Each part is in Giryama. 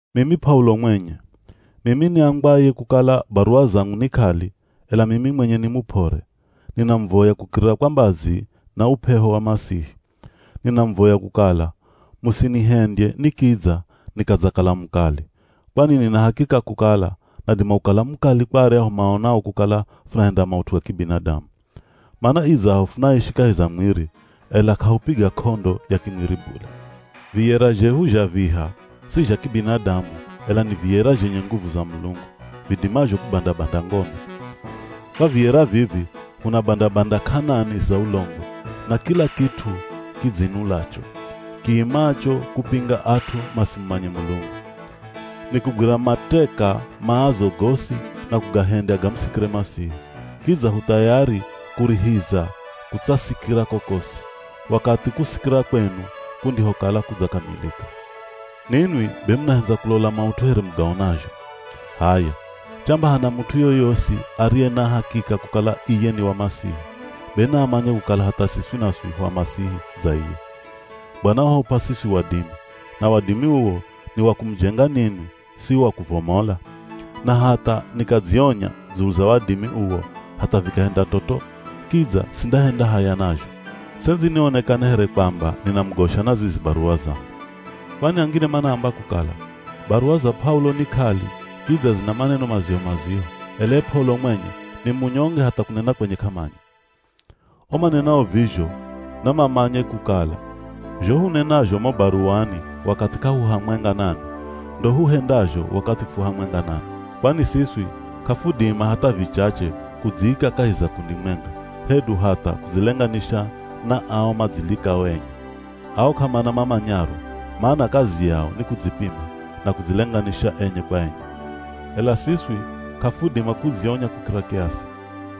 Mimi P'aulo mwenye, mimi niambwaye kukala baruwa zangu ni k'ali, ela mimi mwenye ni mup'ore, ninamuvoya kukirira kwa mbazi na up'eho wa Masihi. Ninamuvoya kukala musinihendye nikidza nikadzakala mukali, kwani nina hakika kukala nadima kukala mukali kwa aryahu maonao kukala funahenda maut'u kibinadamu. Mana idzaho funaishi kahi za mwiri, ela k'ahupiga k'ondo ya kimwiri bule. Viyera zhehu zha viha si zha kibinadamu ela ni viyera zhenye nguvu za Mulungu, vidimazho kubanda-banda ngome. Kwa viyera vivi hunabanda-banda k'anani za ulongo, na kila kit'u kidzinulacho, kiimacho kupinga at'u masimumanye Mulungu. Nikugwira mateka maazo gosi na kugahendya gamusikire Masihi. Kidza hu thayari kurihiza kutsasikira kokosi, wakathi kusikira kwenu kundihokala kudzakamilika. Ninwi be munahendza kulola maut'u here mugaonazho. H'aya, chamba hana mut'u yoyosi ariye na hakika kukala iye ni wa Masihi, be naamanye kukala hatha siswi naswi hu a Masihi dza iye. Bwana wahup'a siswi wadimi, na wadimi uwo ni wa kumujenga ninwi si wa kuvomola. Na hatha nikadzionya dzulu za wadimi uwo hatha vikahenda toto, kidza sindahenda haya nazho. Ts'endzi nionekane here kwamba ninamugosha na zizi baruwa zangu. Kwani angine manaamba kukala, “Baruwa za P'aulo ni k'ali, kidza zina maneno maziho-maziho, ela ye P'aulo mwenye ni munyonge hatha kunena kwenye k'amanya.” O manenao vizho namamanye kukala, zho hunenazho mo baruwani wakathi k'ahuhamwenga nanwi, ndo huhendazho wakathi fu hamwenga nanwi. Kwani siswi k'afudima hatha vichache kudziika kahi za kundi mwenga, hedu hatha kudzilenganisha na ao madzilikao enye. Ao k'amana mamanyaro, mana kazi yao ni kudzipima, na kudzilenganisha enye kwa enye. Ela siswi k'afudima kudzionya kukira kiasi.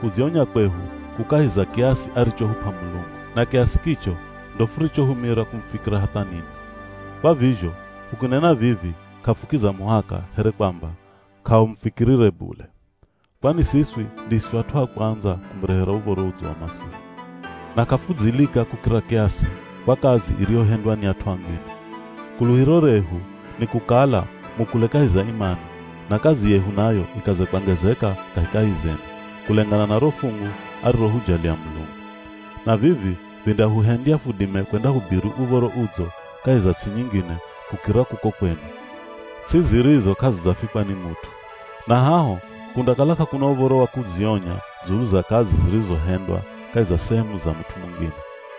Kudzionya kwehu ku kahi za kiasi arichohup'a Mulungu. Na kiasi kicho ndo furichohumira kumufikira hatha ninwi. Kwa vizho, hukinena vivi k'afukiza muhaka here kwamba k'ahumufikirire bule. Kwani siswi ndiswi at'u a kwandza kumurehera Uv̱oro Udzo wa Masihi. Na k'afudzilika kukira kiasi kwa kazi iriyohendwa ni at'u angine. Kuluhiro rehu ni kukala mukule kahi za imani, na kazi yehu nayo ikaze kwangezeka kahikahi zenu, kulengana na ro fungu arirohujalia Mulungu. Na vivi vindahuhendya fudime kwendahubiri Uv̱oro Udzo kahi za ts'i nyingine kukira kuko kwenu, ts'i zirizo k'azidzafikwa ni mut'u. Na haho kundakala k'akuna uv̱oro wa kudzionya dzulu za kazi zirizohendwa kahi za sehemu za mut'u mungine.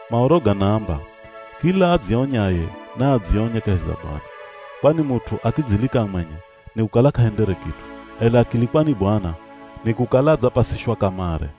Maoro ganaamba, “Kila adzionyaye, naadzionye kahi za Bwana.” Kwani mut'u akidzilika mwenye nikukala k'ahendere kit'u, ela akilikwa ni Bwana nikukala adzapasishwa kamare.